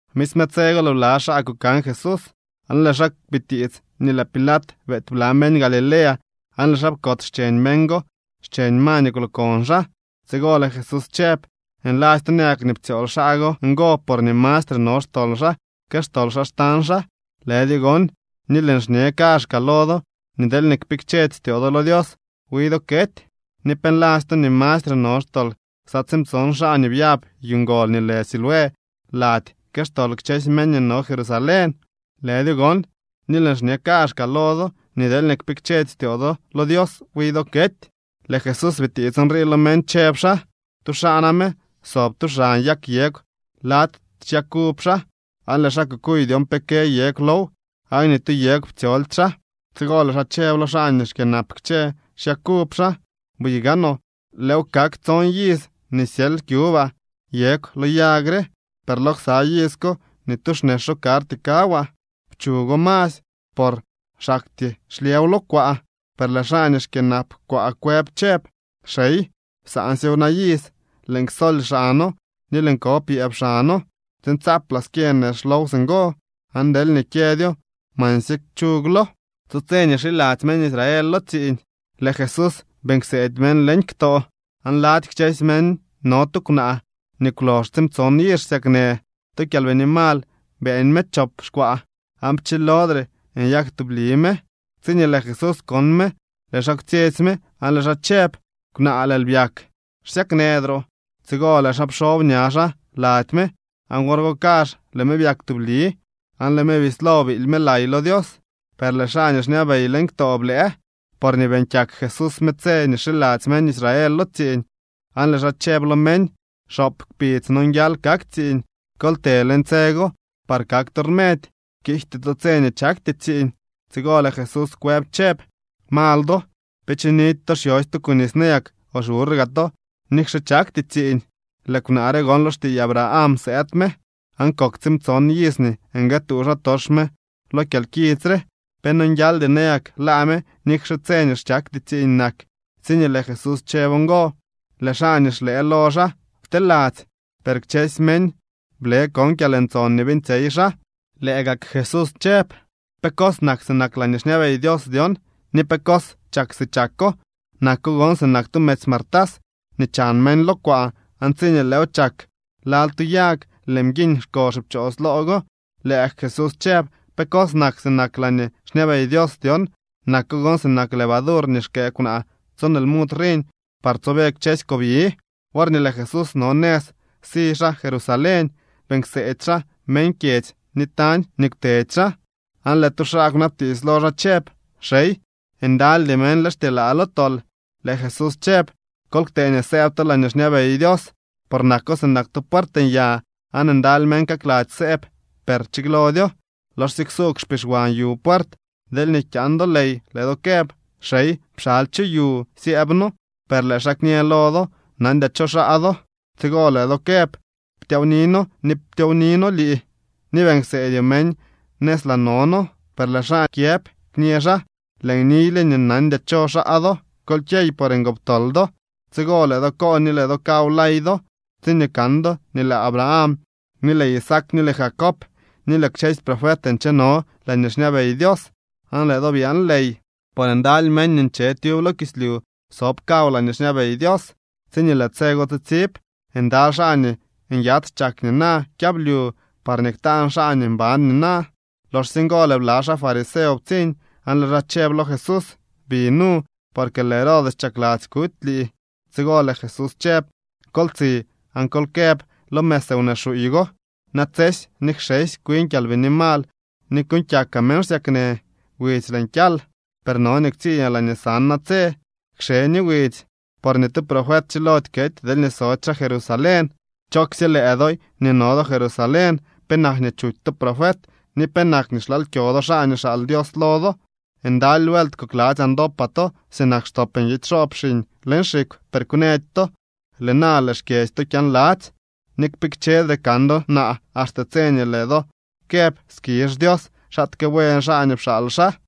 Misme tse go lëë bla xaa kukan Jesús aan lëë xaa bitiits nii lëë Pilat beety bla meñ Galilea aan lëë xaa pkots xcheñ meñ go xcheñ ma nii kwlokon xaa. Tsigo lëë Jesús chëb: —Nladzy to nayak nii ptsyool xaa go ngo porñee mastre no xtol xaa que xtol xaa xtañ xaa. Lëdyo gon. Ni lëën xñe kaazhkaa lo do nii deelñee kpikchedy styoo do lo Dios, wi do kety. ¿Ni pe nladzy to nii mastre no xtol ksa tsiimtson xaa nii byab yu ngol nii lë Siloé lady que xtol kchësy meñ nii no Jerusalén? Lëdyo gon. Ni lëën xñe kaazhkaa lo do nii deelñee kpikchedy styoo do lo Dios, wi do kety. Lëë Jesús bitiits nrii lo meñ, chëb xaa: —Tu xaa name sob tub xan yag yegw lady xyag uv xaa, aan lëë xaa kukuy dyon pe kë yegw low, aan ni tu yegw ptsyoldy xaa. Tsigo lëë xaa chëb lo xaa nii xkyënap kchë xyag uv xaa: “Buy gaanoo, lëëw kak tson iz nii xyely kyubaa yegw lo yag re, per lo ksa iz ko ni tu xnexo karty kawaa. Pchugo masy, por xaktyee xlyëw lo kwaa.” Per lëë xaa nii xkyënap kwaa kwëb chëb: “Xey, psaansyew na iz. Lëën ksoly xano ni lëën ko pyëëb xano, tsiin tsaaplaa skyë nex low singo. Aan deelñee kyëdyo, mansye kchugloo.” Tu tse nii xiladzy meñ Israel lo tsiiñ lëë Jesús beeñ kseedy meñ leñ ktoo. Aan lady kchësy meñ no tu kwnaa nii kwlox tsiimtson iz xsyaknë. Tu kyalbini mal beeñ me chop xkwaa, aan pchilodre nyak tubli me. Tsiñee lëë Jesús kon me, lëë xaa kwtsyetsy me aan lëë xaa chëb: —Kwnaa, lëël byak, xsyaknëdroo. Tsigo lëë xaa pxob ña xaa lady me, aan wor go kazh lëë me byak tubli, aan lëë me bislo biily me lay lo Dios. Per lëë xaa nii xñabey leñ ktoo blëë, porñee beeñ kyak Jesús me tse nii xiladzy meñ Israel lo tsiiñ, aan lëë xaa chëb lo meñ: —Xoop kpidz nonguial kak tsiiñ. Kol të leñ tse go par kak to rmedy, kiijty to tse nii chakty tsiiñ. Tsigo lëë Jesús kwëb chëb: —Mal do. ¿Pe chinidy to xyosy to kunis nayak o xburr gaa to nikxe chakty tsiiñ? Lëë kwnaa re gon lo xtiiy Abraham sëëd me, aan kok tsiimtson iz nii nguëëtuu xaatox me lo kyalkits re. ¿Pe nonguialdy nayak laa me nikxe tse nii chakty tsiiñ nak? Tsiñee lëë Jesús chëb ngo, lëë xaa nii xlëë lo xaa pteladzy, per kchësy meñ ble kon kyalntson nii beeñtsyey xaa. Lëë gak Jesús chëb: —¿Pe cos nak sinak laañee xñabey Dios dyon, ni pe cos chak si chako? Nako gon sinak tu medzy martas nii chan meñ lo kwaa aan tsiñee lëëw chak lal tu yag, lëë mguiñ xko xipchoos loo go. Lëë gak Jesús chëb: —¿Pe cos nak sinak laañee xñabey Dios dyon? Nako gon sinak levadur nii xkëë kwnaa tson lmud riñ par tsobe kchësy kobyi. Worñee lëë Jesús no nëz si xaa Jerusalén, beeñ kseedy xaa meñ kyedzy ni tañ nii kwtedy xaa. Aan lëë tu xaa kwnabtiits lo xaa chëb: —Xey, ¿ndalydy meñ lë xtyelaa lo tol? Lëë Jesús chëb: —Kol ktee nii sëëb to laañee xñabey Dios, por nako sinak tu puert nya aan ndaly meñ kakladzy sëëb, per kchilodyo. Loxsye ksuugw xpixwan yu puert, deelñee kyaan do ley lëë do këb: “Xey, pxaly chu yu syëëb noo.” Per lëë xaa kñë lo do: “Nandyaa cho xaa do.” Tsigo lëë do këb: “Ptyaawni noo ni ptyowni noo lii, ni beeñ kseedyoo meñ nëz laa no noo.” Per lëë xaa kyëb kñë xaa: “Lëën niyle nii nandyaa cho xaa do. Kol kyey por ngoptol do.” Tsigo lëë do koon ni lëë do kaw lay do tsiñee kan do nii lëë Abraham ni lëë Isaac ni lëë Jacob ni lëë kchësy profet ncheno laañee xñabey Dios, aan lëë do byaan ley. Por ndaly meñ nii nche tyub lo kislyu sob kaw laañee xñabey Dios. Tsiñee lëë tse go tsitsib ndaly xaa nii nyats chak nina kyablyu parñee ktaan xaa nii mban nina. Loxsye ngo lëë bla xaa fariseo ptsiñ, aan lëë xaa chëb lo Jesús: —Bi nu, porque lëë Herodes chakladzy kuty lii. Tsigo lëë Jesús chëb: —Kol tsi aan kol këb lo mëz wnee xuuy go: “Natsesy ni kxesy kwin kyalbini mal ni kuuñ kyakaa meñ xsyaknë, widzy lëën kyal.” Per no nii ktsiñaa laañee san natse, kxe ni widzy. Por ni tu profet chilody kety deelñee sody xaa Jerusalén. ’¡Chooksye lëë doy nii no do Jerusalén! ¿Penak nii chuty to profet ni penak nii xlaal kyo do xaa nii xaal Dios lo do? ¡Ndaly vuelt kokladzyaa ndopaa to sinak xtop nguidy xoob xiñ leñ xikw, per kwnëdy to! Lëë na lëë xkyedzy to kyaanladzy. Ni kpikchedre kan do naa axte tse nii lëë do këb: “Skizh Dios, xaatke buen xaa nii pxaal xaa.”